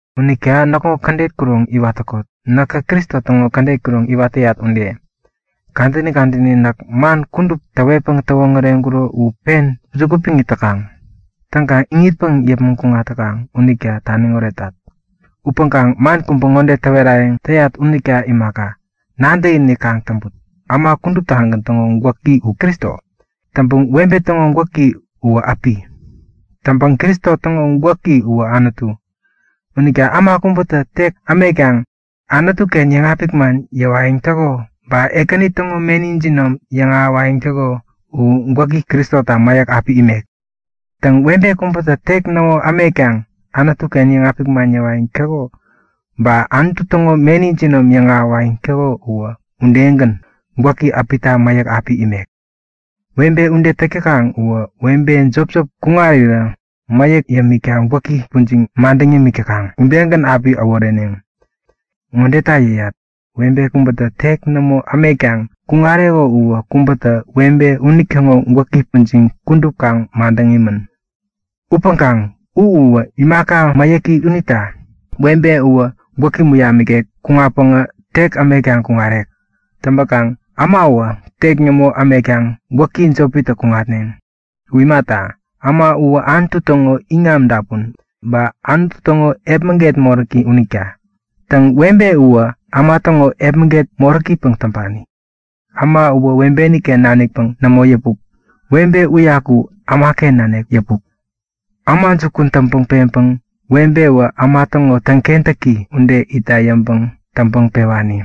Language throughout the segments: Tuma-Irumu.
Unita näkŋo kädet kuroŋ iwat täkot, näkä Kristo täŋo kädet kuroŋ iwat täyat ude. Kadäni kadäni näk man kudup täwetpäŋ täwoŋäreŋkuro u pen juku piŋ it täkaŋ. Täŋkaŋ iŋitpäŋ yäpmäŋ kuŋat täkaŋ unita taniŋ oretat. Upäŋkaŋ man kubä ŋode täwerayäŋ täyat unita imaka, nadäkinik kaŋ täŋput; Äma kuduptagän täŋo gwäki u Kristo. Täŋpäŋ webe täŋo gwäki uwä äpi. Täŋpäŋ Kristo täŋo gwäki uwä Anutu. Unita äma kubätä tek ämetkaŋ Anutu-ken yäŋapik man yäwayäŋ täko ba Ekäni täŋo meni jinom yäŋahäwayäŋ täko u gwäki Kristota mäyäk api imek. Täŋ, webe kubätä tek nämo ämetkaŋ Anutu-ken yäŋapik man yäwayäŋ täko, ba Anutu täŋo meni jinom yäŋahäwayäŋ täko uwä udegän gwäki äpita mäyäk api imek. Webe ude täk täkaŋ uwä webe jopjop kuŋarirä mäyäk yämikta gwäki pujiŋ madäŋ yämik täkaŋ udegän api äworeneŋ. Ŋodeta yäyat; Webe kubätä tek nämo ämetkaŋ kuŋareko uwä kubätä webe unitäŋo gwäki pujiŋ kudup kaŋ madäŋ imän. Upäŋkaŋ u uwä imaka mäyäki unita webe uwä gwäk muyam nikek kuŋatpäŋä tek ämetkaŋ kuŋarek. Täŋpäkaŋ ämawä tek nämo ämetkaŋ gwäki jopitä kuŋatneŋ. U imata, äma uwä Anutu täŋo iŋam dapun ba Anutu täŋo epmäget moräki unita. Täŋ, webe uwä äma täŋo epmäget moräkipäŋ täŋpani. Äma uwä webeken nanikpäŋ nämo yäpuk. Webe uyaku ämaken nanik yäpuk. Äma jukun täŋpäŋ peŋkaŋ webewä äma täŋo täŋkentäki ude itta yäŋpäŋ täŋpäŋ pewani.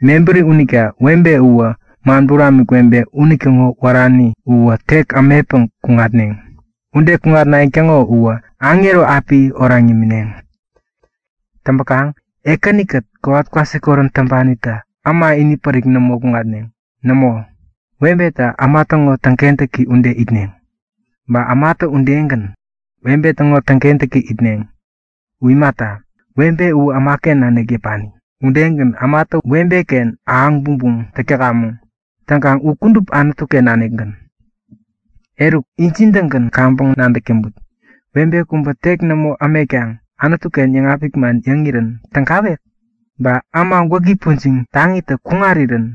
Mebäri unita webe uwä man buramik webe unitäŋo wärani uwä tek ämetpäŋ kuŋatneŋ. Ude kuŋatnayäŋ täŋo uwä aŋero api oraŋ yämineŋ. Täŋpäkaŋ Ekäni-kät kowat kwasikorän täŋpanitä webe inipärik, äma inipärik nämo kuŋatneŋ. Nämo, webetä äma täŋo täŋkentäki ude itneŋ, ba ämatä udegän, webe täŋo täŋkentäki itneŋ. U imata, webe uwä ämaken nanik yäpani. Udegän ämatä webeken ahäŋ bumbum täk täkamäŋ. Täŋkaŋ u kudup Anutu-ken nanikgän. Eruk, injin-tägän kaŋpäŋ nadäk täŋput; Webe kubä tek nämo ämetkaŋ Anutu-ken yäŋapik man yäŋirän tägawek? Ba äma gwäki pujiŋ taŋitä kuŋarirän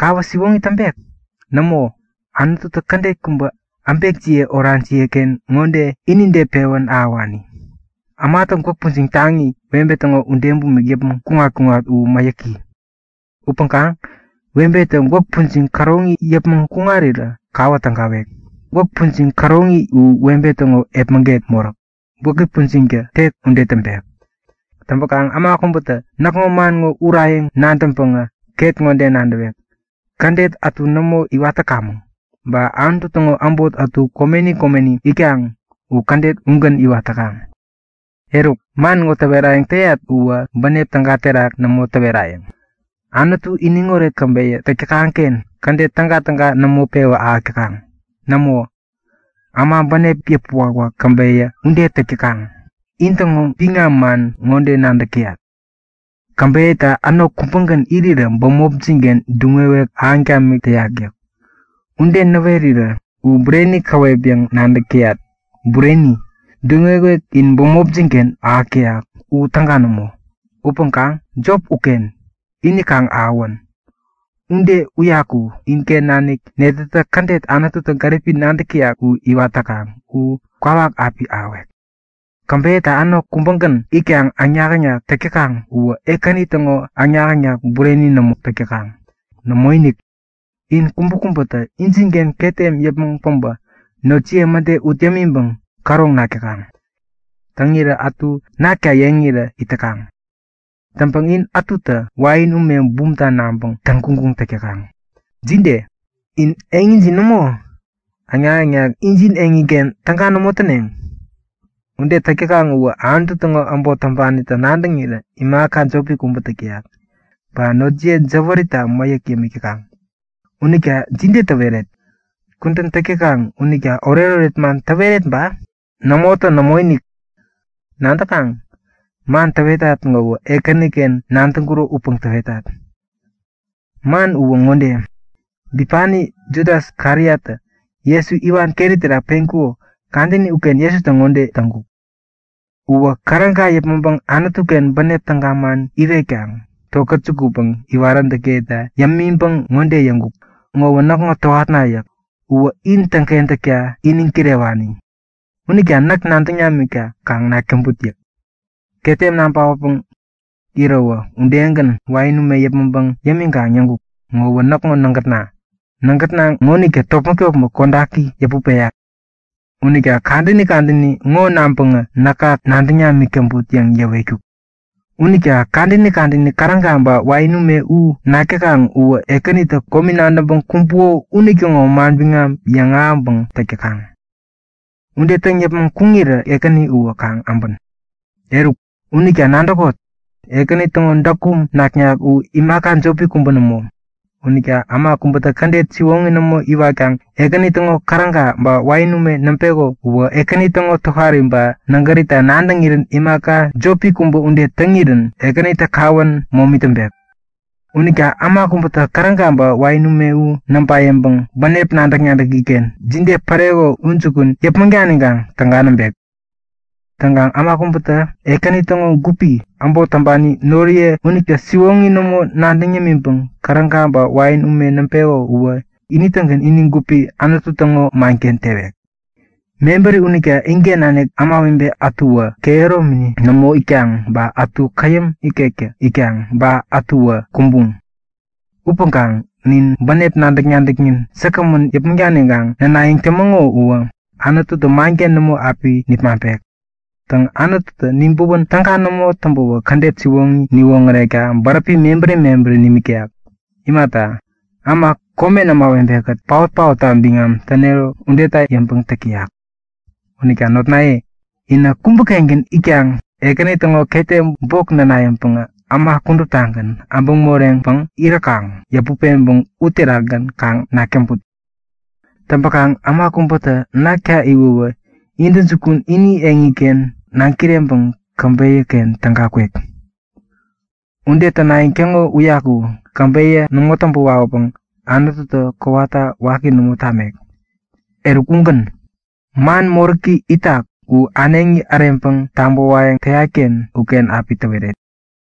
kawä siwoŋi täŋpek? Nämo! Anututä kädet kubä äbekjiye orajiye-ken ŋode inide pewän ahäwani; Ämatä gwäk pujiŋ taŋi, webe täŋo ude bumik yäpmäŋ kuŋat-kuŋat u mäyäki. Upäŋkaŋ webetä gwäk pujiŋ käroŋi yäpmäŋ kuŋarirä kawä tägawek. Gwäk pujiŋ käroŋi u webe täŋo epmäget moräk. Gwäki pujiŋtä tek ude täŋpek. Täŋpäkaŋ äma kubätä näkŋo man ŋo urayäŋ nadäŋpäŋä ket ŋode nadäwek; Kädet ätu nämo iwat täkamäŋ, ba Anutu täŋo äbot ätu komeni komeni itkaŋ u kädet ugän iwat täkaŋ. Eruk, man ŋo täwerayäŋ täyat uwä bänep täga terak nämo täwerayäŋ. Anutu iniŋoret käbeyä täk täkaŋ-ken kädet tägatäga nämo pewä ahäk täkaŋ. Nämo, äma bänep yäpä wakwak käbeyä ude täk täkaŋ. In-täŋo biŋam man ŋode nadäk täyat; Käbeyäta änok kubägän irirä bämopjin-ken duŋ-wewek ahäŋ tamik täyak yäk. Ude näwerirä u bureni käwep yäŋ nadäk täyat. Bureni, duŋ-wewek in bämopjin-ken ahäk täyak u täga nämo. Upäŋkaŋ jop uken, ini kaŋ ahäwän. Ude uyaku inken nanik netätä kädet Anututä gäripi nadäk täyak u iwat täkaŋ u kwawak api ahäwek. Täŋpäkaŋ käbeyäta änok kubägän itkaŋ äŋnak-äŋnak täk täkaŋ uwä Ekäni täŋo äŋnak-äŋnak bureni nämo täk täkaŋ. Nämoinik! In kubäkubätä injinken ketem yäpmäŋ päbä notjiye mäde ut yämiŋpäŋ käroŋ nak täkaŋ. Täŋirä ätu nakta yeŋirä it täkaŋ. Täŋpäŋ in ätutä wain ume bumta naŋpäŋ täŋguŋguŋ täk täkaŋ. Jide? In eŋijin nämo? Äŋnak-äŋnak injin eŋiken täga nämo täneŋ? Ude täk täkaŋ uwä Anutu täŋo äbot täŋpanita nadäŋirä imaka jopi kubä täk täyak. Ba notjiye jäwärita mäyäk yämik täkaŋ. Unita jide täweret? Kudän täk täkaŋ unita oretoret man täweret ba? Nämotä nämoinik! Nadäkaŋ? Man täwetat ŋowä Ekäniken nadäŋkuro upäŋ täwetat. Man uwä ŋode; Bipani Judas Kariottä Jesu iwan keri terak teŋkuko kadäni uken Jesutä ŋode täŋkuk; Uwä käräga yäpmäŋpäŋ Anutu-ken bänep täga man iwetkaŋ tokät jukutpäŋ iwaräntäkiyeta yämiŋpäŋ ŋode yäŋkuk; Ŋowä näkŋo gupna yäk. Uwä in täŋkentäkta iniŋ kirewani. Unita näk nadäŋ namikta kaŋ nak täŋput yäk. Ketem naŋ paotpäŋ iräwä udegän wain ume yäpmäŋpäŋ yämiŋkaŋ yäŋkuk; Ŋowä näkŋo nägätna. Nägätna ŋonitä topmäk-topmäk kodaki yäput peyak yäk. Unita kadäni kadäni ŋo naŋpäŋä näka kaŋ nadäŋ namik täŋput yäŋ yäwetkuk. Unita kadäni kadäni käräga ba wain ume u nak täkaŋ uwä Ekänitä komi nadäŋpäŋ kumbuko unitäŋo manbiŋam yäŋahäŋpäŋ täk täkaŋ. Ude täŋ yäpmäŋ kuŋirä Ekäni uwä kaŋ äbän. Eruk, unita nadäkot; Ekäni täŋo däkum naknak u imaka jopi kubä nämo. Unita äma kubätä kädet siwoŋi nämo iwatkaŋ Ekäni täŋo käräga ba wain ume näŋpeko uwä Ekäni täŋo tohari ba nägärita nadäŋirän imaka jopi kubä ude täŋirän Ekänitä kawän momi täŋpek. Unita äma kubätä käräga ba wain ume u näŋpa yäŋpäŋ bänep nadäk-nadäki-ken jide päreko u jukun yäpmäŋ daniŋkaŋ täga näŋpek. Täŋkaŋ äma kubätä Ekäni täŋo gupi, äbot täŋpani noriye unita siwoŋi nämo nadäŋ yämiŋpäŋ käräga ba wain ume näŋpeko uwä ini-tägän ini gupi Anutu täŋo manken tewek. Mebäri unita inken nanik ämawebe ätuwä kehäromini nämo itkaŋ ba ätu käyäm ikektä itkaŋ ba ätuwä kumbuŋ. Upäŋkaŋ nin bänep nadäk-nadäknin säkgämän yäpmäŋ daniŋkaŋ nänayäŋ tämäŋo uwä Anututä manken nämo api nipmaŋpek. Täŋ, Anututä nibäwän täga nämo täŋpäwä kädet siwoŋi niwoŋärekta bäräpi mebäri mebäri nimik täyak. Imata, äma komen ämawebe-kät paot-paotta biŋam tänero udeta yäŋpäŋ täk täyak. Unita notnaye, inä kubä-kengän itkaŋ Ekäni täŋo ketem bok näna yäŋpäŋä äma kuduptagän äbäŋ moreŋpäŋ iräkaŋ yäput-peŋpäŋ uterakgän kaŋ nak täŋput. Täŋpäkaŋ äma kubätä nakta iwäwä intäjukun ini eŋiken naŋ koreŋkaŋ käbeyä-ken täga kwek. Ude tänayäŋ täŋo uyaku käbeyä nämo täŋpä wawäpäŋ Anututä kowata waki nämo tamek. Eruk ugän. Man moräki itak u äneŋi äreŋpäŋ tabäwayäŋ täyat-ken uken api täweret.